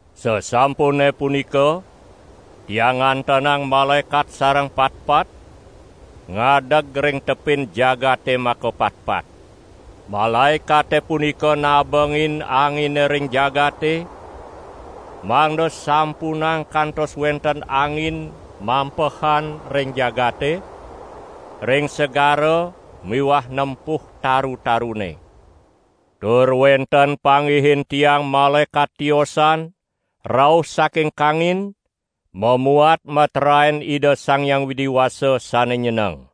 Sasampune punika, tiang ngantenang malaekat sareng patpat, ngadeg ring tepin jagate makapatpat. Malaekate punika nabengin angine ring jagate, mangda sampunang kantos wenten angin mampehan ring jagate, ring segara miwah nempuh taru-tarune. Tur wenten panggihin tiang malaekat tiosan rauh saking kangin mamuat meteraen Ida Sang Hyang Widi Wasa sane nyeneng.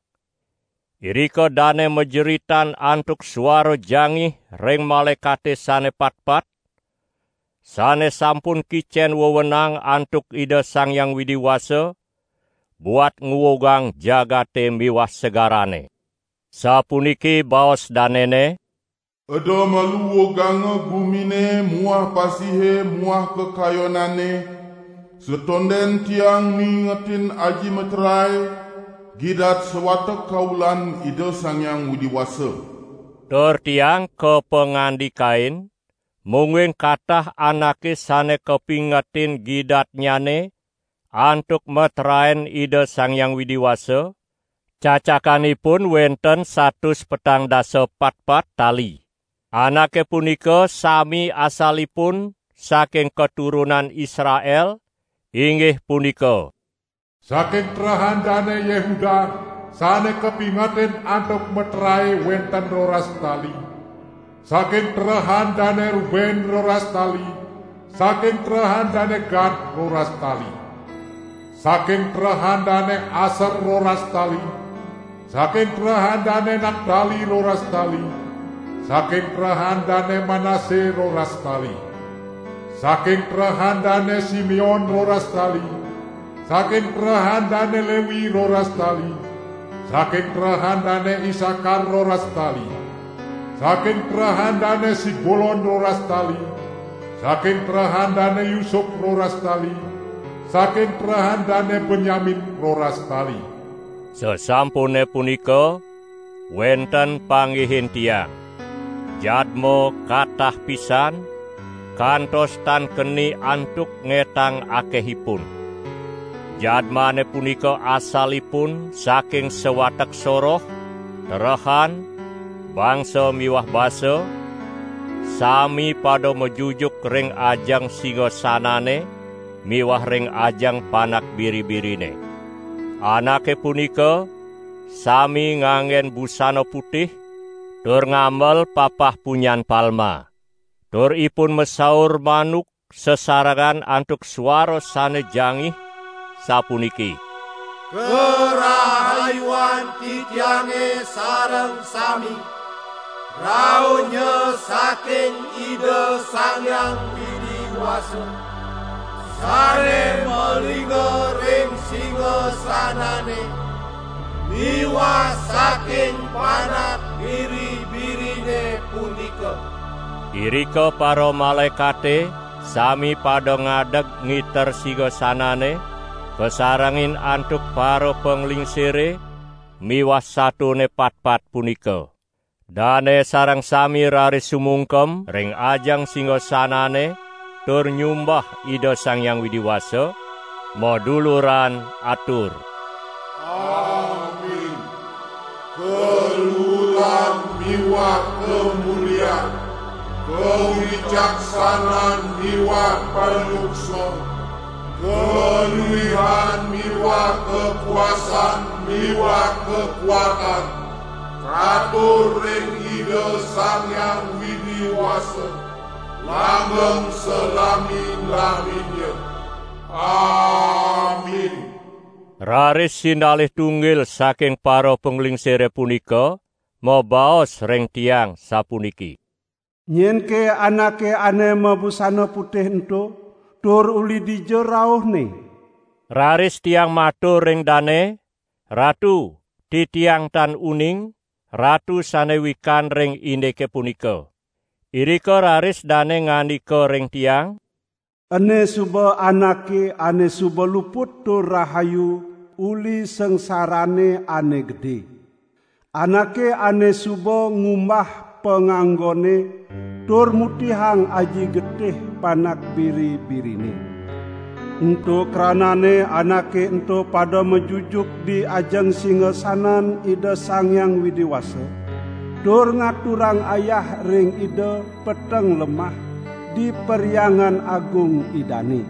Irika dane majeritan antuk suara jangih ring malaekate sane patpat, sane sampun kicen wewenang antuk Ida Sang Hyang Widi Wasa buat nguugang jagate miwah segarane. Sapuniki baos danene: "Eda malu uuganga gumine muah pasihe muah kakayonane, satonden tiang mingetin aji meterae, gidat sawatek kaulan Ida Sang Hyang Widi Wasa!" Tur tiang kapangandikain, mungguing katah anake sane kapingetin gidatnyane antuk meteraen Ida Sang Hyang Widi Wasa, cacakan ipun wenten satus petang dasa patpat tali. Anake punika sami asalipun saking katurunan Israel, inggih punika: Saking terehan Dane Yehuda sane kapingetin antuk meterae wenten roras tali, saking terehan Dane Ruben roras tali, saking terehan Dane Gad roras tali. Saking terehan Dane Aser roras tali, saking terehan Dane Naptali roras tali, saking terehan Dane Manase roras tali. Saking terehan Dane Simeon roras tali, saking terehan Dane Lewi roras tali, saking terehan Dane Isakar roras tali. Saking terehan Dane Sebulon roras tali, saking terehan Dane Yusup roras tali, saking terehan Dane Benyamin roras tali. Sasampune punika wenten panggihin tiang, jadma katah pisan, kantos tan keni antuk ngetang akehipun. Jadmane punika asalipun saking sawatek soroh, terehan, bangsa miwah basa, sami pada majujuk ring ajeng singasanane miwah ring ajeng Panak Biri-birine. Anake punika sami nganggen busana putih tur ngamel papah punyan palma. Tur ipun masaur manuk sasarengan antuk suara sane jangih sapuniki: "Karahayuan titiange sareng sami rauhnya saking Ida Sang Hyang Widi Wasa sane malingga ring singasanane miwah saking Panak Biri-birine punika!" Irika paramalaekate sami pada ngadeg ngiter singasanane, kasarengin antuk parapanglingsire miwah satone patpat punika. Dane sareng sami raris sumungkem ring ajeng singasanane tur nyumbah Ida Sang Hyang Widi Wasa, maduluran atur: "Amin! Kaluuran miwah kamulian, kawicaksanan miwah panyuksma, kaluihan miwah kakuasan miwah kakuatan katur ring Ida Sang Hyang Widi Wasa, langgeng salami-laminnya! Amin!" Raris sinalih tunggil saking parapanglingsire punika mabaos ring tiang sapuniki: "Nyenke anake ane mabusana putih ento, tur uli dija rauhne?" Raris tiang matur ring dane: "Ratu, titiang tan uning, Ratu sane wikan ring indike punika." Irika raris dane ngandika ring tiang: "Ene suba anake ane suba luput tur rahayu uli sangsarane ane gede. Anake ane suba ngumbah panganggonne tur mutihang aji getih Panak Biri-birine. Ento kranane anake ento pada majujuk di ajeng singasanan Ida Sang Hyang Widi Wasa tur ngaturang ayah ring Ida peteng lemah di Perhyangan Agung Idane.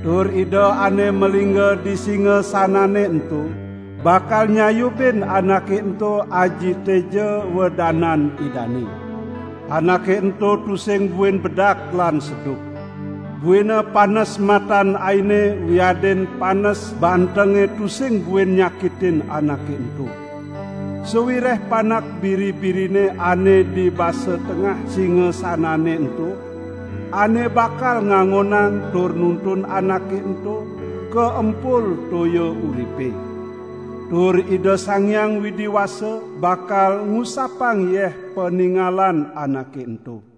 Tur Ida ane malingga di singasanane ento bakal nyayubin anake ento aji teja wedanan Idane. Anake ento tusing buin bedak lan seduk. Buina panes matan aine wiadin panes bantenge tusing buin nyakitin anake ento. Sawireh Panak Biri-birine ane di basa tengah singasanane ento, ane bakal ngangonang tur nuntun anake ento ka empul toya uripe. Tur Ida Sang Hyang Widi Wasa bakal ngusapang yeh paningalan anake ento."